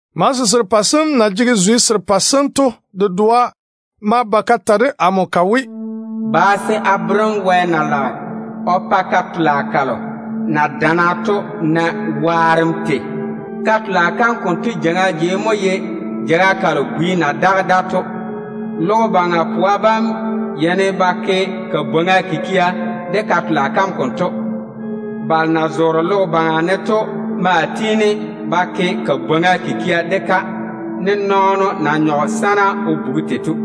Malese serepɛ sem na jege zwe serepɛ sem to dedoa ma ba ka ta de amo ka we, “Ba se a bere‑m Wɛ na lage o pa ka-tola kalo na dana to na waarem tei to. Ka-tola kam konto jeiŋa jei mo ye jeiga kalo bwi na daga da to. Logo baŋa pwa bam yeini ba ke bwoorim de ka-tola kam konto. Balo na zoore logo baŋa ne to de maa tiini ba bwoori de-ka, ne nɔɔno na nyɔge sana o bugi tei to.”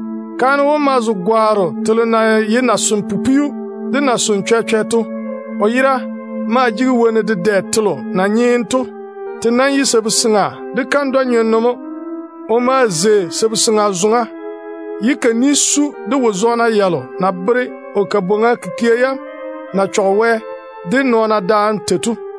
Kaane wom ma zo gwaaro telo na ye nason-pupwiu de nasonno chwɛ-chwɛ to. O yera maa jege wonnu dedɛ telo na nyeene to. Te nam ye sabu-seŋa de kandwa-nyenno mo. O ma zei sabu-seŋa zoŋa, ye ka ni su de wo-zɔɔna yalo na bere o bwoorim kikia yam na jege digiru tei to.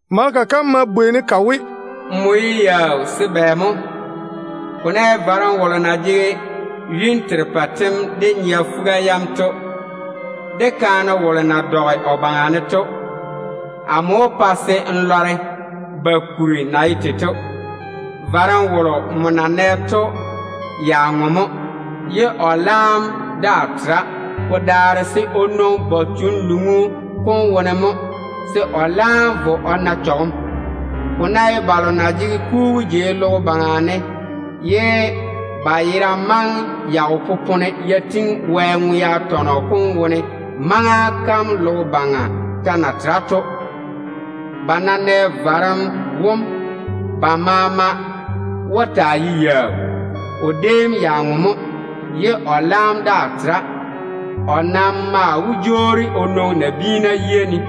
Maleka kam ma bwei-ne ka we, “Ko ke‑m yaau se bɛ mo? Ko ná ye juru kolo na jege yuni terepɛ tem de nyea fuga to, de kaane wolo na dɔge o baŋa ne to, amo wó pa n lɔre ba kuri na ye tei to. Juru kolo nmo na nɛ to ya ŋwe mo. Ko nam daa tera. Ko daare se ko nwoŋi gwoŋ-chanluŋu kom wone mo, se ko laam vo ko na chɔgem. Ko ná ye balo na zoore logo baŋa ne ye ba yera maŋe ya wo popone ya tiŋi Wɛ ŋwe-doŋa tɔnɔ kom wone maŋa kam logo baŋa ta na tera to, ba ná nɛ juru kom, ko wó so ba maama. Ko déem ya ŋwe mo, ye ko laam daa tera. Ko nam wó jwoori ko ba ko nwoŋi nabiina yiga ne.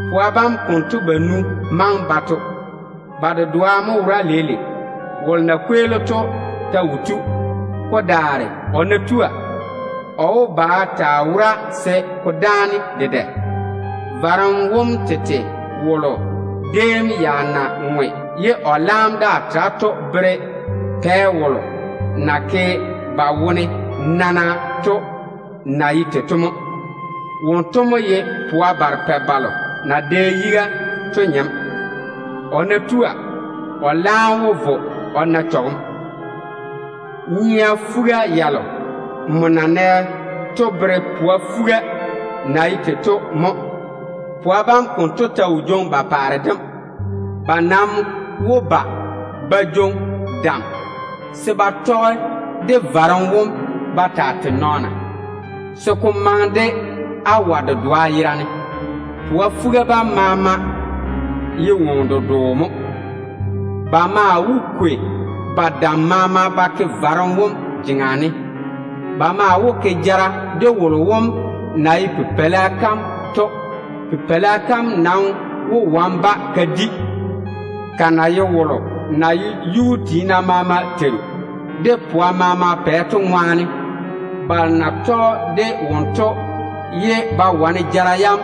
Pwa bam konto banu maŋe ba to mo. Ba dedoa mo wora leile. Wolo na kweeli to ta wo tu. Ko daare, o ná tua, o paare dem bá dáane dedɛ. Juru kom tete kolo déem ya na ŋwe ye ko laam daa tera to bere pɛ wolo na ke ba wone nana to mo. Wonto mo ye pwa barepɛ balo na dɛ yiga to wo nɔɔno. O nam ná tua, o de laam wó vo o na chɔgem. Nyea fuga yalo nmo na nɛ to bere pwa fuga na ye tei to mo. Pwa bam konto ta wo jwoŋi ba paare dem. Ba nam wó ba ba jwoŋi dam se ba tɔge de varem wom ba taa tei nɔɔna, se ko maŋe de awa dedoa yerane. Pwa fuga bam maama jege boboŋe dedwe mo. Ba maa wó kwei ba dam maama ba ke juru kom jeŋa ne. Ba maa wó ke jara de wolo wom na ye Pipeila kam to. Pipeila kam nam wó wane-ba ka di, ka na ye wolo na ye yuu tiina maama Yuu-tu, de pwa maama Pɛ to ŋwaane. Balo na tɔge de wonto ye ba wane jara yam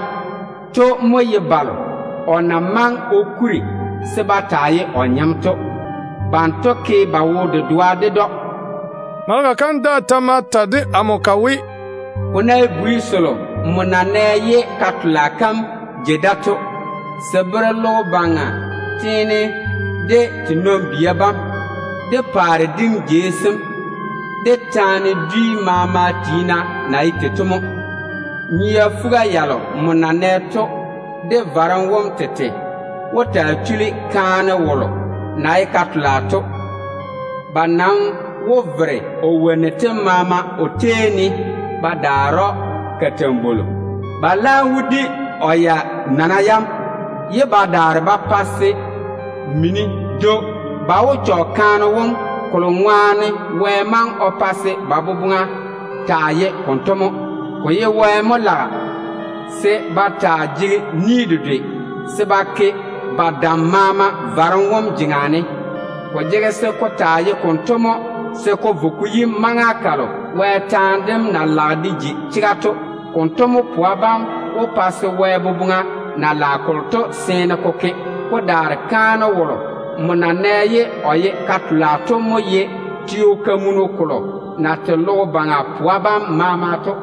to mo ye balo o na maŋe o kuri se ba taa ye o nɔɔna to. Banto mo yɔɔre ba jege wo-dedoa ded‑o.” Maleka kam daa ta ma ta de amo ka we, “Ko ná ye bwi selo nmo na nɛ ye ka-tola kam jei da to, se bere logo baŋa teene de te nɔn-bia bam, de paare dim jei sem, de taana dwi maama tiina na ye tei to mo. Nyea fuga yalo nmo na nɛ to, de juru kom tete wó taa chuli ka-tola kam. Ba nam wó vere o wonnu tem maama o tei ne ba daare‑o kalambwolo. Ba laam wó di o ya-nɔna yam, ye ba daare ba zwɛ‑o de mini. Ba wó chɔge‑o konto, kolo ŋwaane Wɛ maŋe o pa se ba boboŋa taa ye konto, ye ba jege ni dedwe se ba ke ba dam maama juru kom jeŋa ne mo. Ko jege se ko taa ye konto mo, se ko vo ko yi maŋa kalo Wɛ taane dem na bere kolo to na wó ji chega, ye o boboŋa seene ya ke to. Ko daare kaane wolo nmo na nɛ ye o ye ka-tola to mo ye te-fɔrɔ kolo na tei logo baŋa pwa bam maama to.”